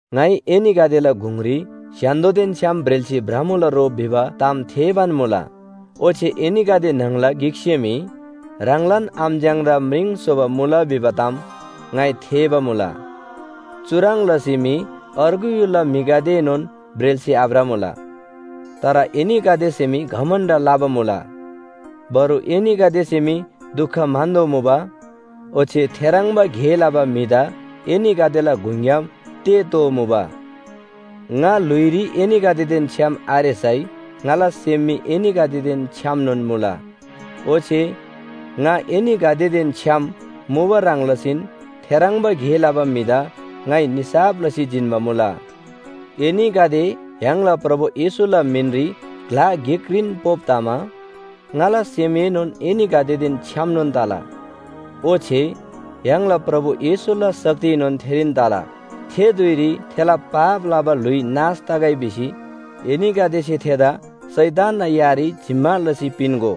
ङाइ एनीगदेला गुङरी स्‍य्‍हान्‍दोदेन छ्‌याम ब्रेल्‍सी भ्रमुला रो भिबा ताम थेःबान मुला। ओच्‍छे एनीगदे न्‍हङला गिकसे मी ह्राङलान आमच्‍याङदा म्रिङ स्‍होबा मुला भिबा ताम ङाइ थेःबा मुला। चुह्रङ् लसी मी अर्गु य्‍हुलला म्‍हिगदेएनोन ब्रेल्‍सी आभ्रमुला। तर एनीगदेसे मी घमण्‍ड लबा मुला। बरु एनीगदेसे मी दुख म्‍हन्‍तोःमुबा, ओच्‍छे थेह्रङ्बा गे लबा म्‍हिदा एनीगदेला गुङग्‍याम तेःतोःमुबा। ङा ल्‍हुइरी एनीगदेदेन छ्‌याम आरेसै ङाला सेम मी एनीगदेदेन छ्‌यामनोन मुला। ओच्‍छे ङा एनीगदेदेन छ्‌याम मुबा ह्रङ् लसीन थेह्रङ्बा गे लबा म्‍हिदा ङाइ निसाफ लसी जिन्‍बा मुला। एनीगदे य्‍हाङला प्रभु येशूला मिनरी ग्‍ला गिकरीन ह्रुप तमा, ङाला सेमएनोन एनीगदेदेन छ्‌यामनोन तला, ओच्‍छे य्‍हाङला प्रभु येशूला शक्तिएनोन थेरीन तला। थे धुइरी थेला पाप लबा ल्‍हुइ नाश तगै भिसी एनीगदेसे थेदा शैतानना यारी जिम्‍मा लसी पिन्‍गो।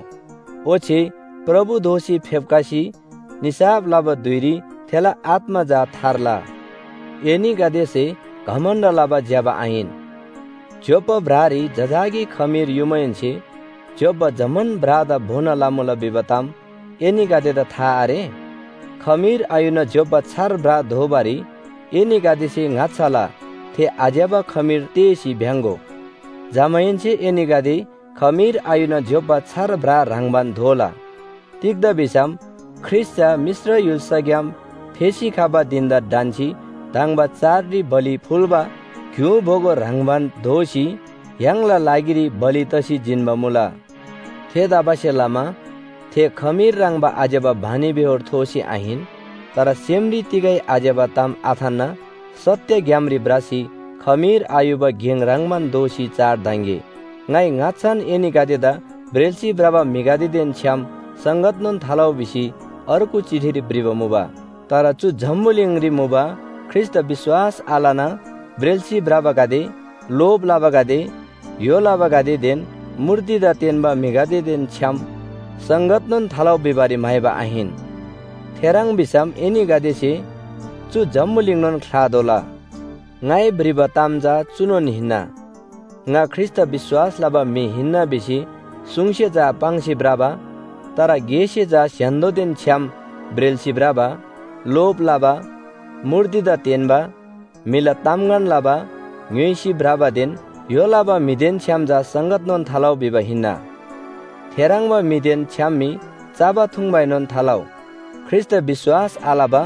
ओच्‍छे प्रभु दोःसी फेप्‍खसी निसाफ लबा धुइरी थेला आत्‍मा चा थार्ला। एनीगदेसे घमण्‍ड लबा ज्‍यबा आहिन। ज्‍योप्‍बा ब्रारी जजाकी खमीर युमाहेन्‍से ज्‍योप्‍बा जम्‍मान ब्रादा भोना लमुला भिबा ताम एनीगदेदा था आरे? खमीर आयुना ज्‍योप्‍बा छार ब्रा दोबारी एनीगदेसे ङाच्‍छाला थे आज्‍यबा खमीर तेःसी भ्‍याङ्‍गो। जमाहेन्‍से एनीगदे खमीर आयुना ज्‍योप्‍बा छार ब्रा ह्रङ्‌बान दोला, तिग्‍दा भिसम ख्रीष्‍ट चा मिश्र य्‍हुल्‍साग्‍याम फेसी खबा धिन‍दा ढन्‍सी धङ्बा चाडरी बलि फुल्‍बा ग्‍यु बोगो ह्रङ्‌बान दोसी य्‍हाङला लागिरी बलि तसी जिन्‍बा मुला। थेतबासेलमा थे खमीर ह्रङ्‌बा आज्‍यबा बानीबेहोर थोसी आहिन, तर सेमरी तिगै आज्‍यबा ताम आथान्‍ना सत्‍य ग्‍यामरी भ्रसी खमीर आयुबा गेङ ह्रङ्‌बान दोसी चाड धङ्‌गे। ङाइ ङाच्‍छान एनीगदेदा ब्रेल्‍सी भ्रबा म्‍हिगदेदेन छ्‌याम संगतनोन थालउ भिसी अर्गु चिठीरी भ्रिबा मुबा। तर चु जम्‍बुलिङरी मुबा ख्रीष्‍टदा विश्‍वास आलना ब्रेल्‍सी भ्रबागदे, लोभ लबागदे, य्‍हो लबागदेदेन मूर्तिदा तेन्‍बा म्‍हिगदेदेन छ्‌याम संगतनोन थालउ भिबारी म्‍हाइबा आहिन। थेह्रङ् भिसम एनीगदेसे चु जम्‍बुलिङनोन ख्‍लातोःला। ङाइ भ्रिबा ताम चा चुनोन हिन्‍ना। ङा ख्रीष्‍टदा विश्‍वास लबा म्‍हि हिन्‍ना भिसी सुङसे चा पाङ्सी भ्रबा, तर गेसे चा स्‍य्‍हान्‍दोदेन छ्‌याम ब्रेल्‍सी भ्रबा, लोभ लबा, मूर्तिदा तेन्‍बा, म्‍हिला तामगन लबा, ङ्‌य्‍होइसी भ्रबादेन य्‍हो लबा म्‍हिदेन छ्‌याम चा संगतनोन थालउ भिबा हिन्‍ना। थेह्रङ्बा म्‍हिदेन छ्‌याम मी चबा थुङ्‌बाएनोन थालउ। ख्रीष्‍टदा विश्‍वास आलबा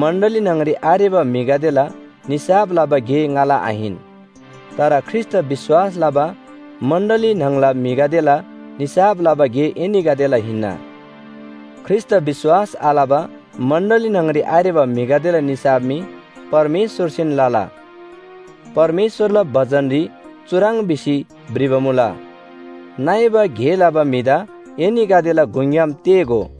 मण्‍डली न्‍हङरी आरेबा म्‍हिगदेला निसाफ लबा गे ङाला आहिन। तर ख्रीष्‍टदा विश्‍वास लबा मण्‍डली न्‍हङला म्‍हिगदेला निसाफ लबा गे एनीगदेला हिन्‍ना। ख्रीष्‍टदा विश्‍वास आलबा मण्‍डली न्‍हङरी आरेबा म्‍हिगदेला निसाफ मी परमेश्‍वरसेन लला। परमेश्‍वरला बचनरी चुह्रङ् भिसी भ्रिबा मुला, “नइबा गे लबा म्‍हिदा एनीगदेला गुङग्‍याम तेःगो।”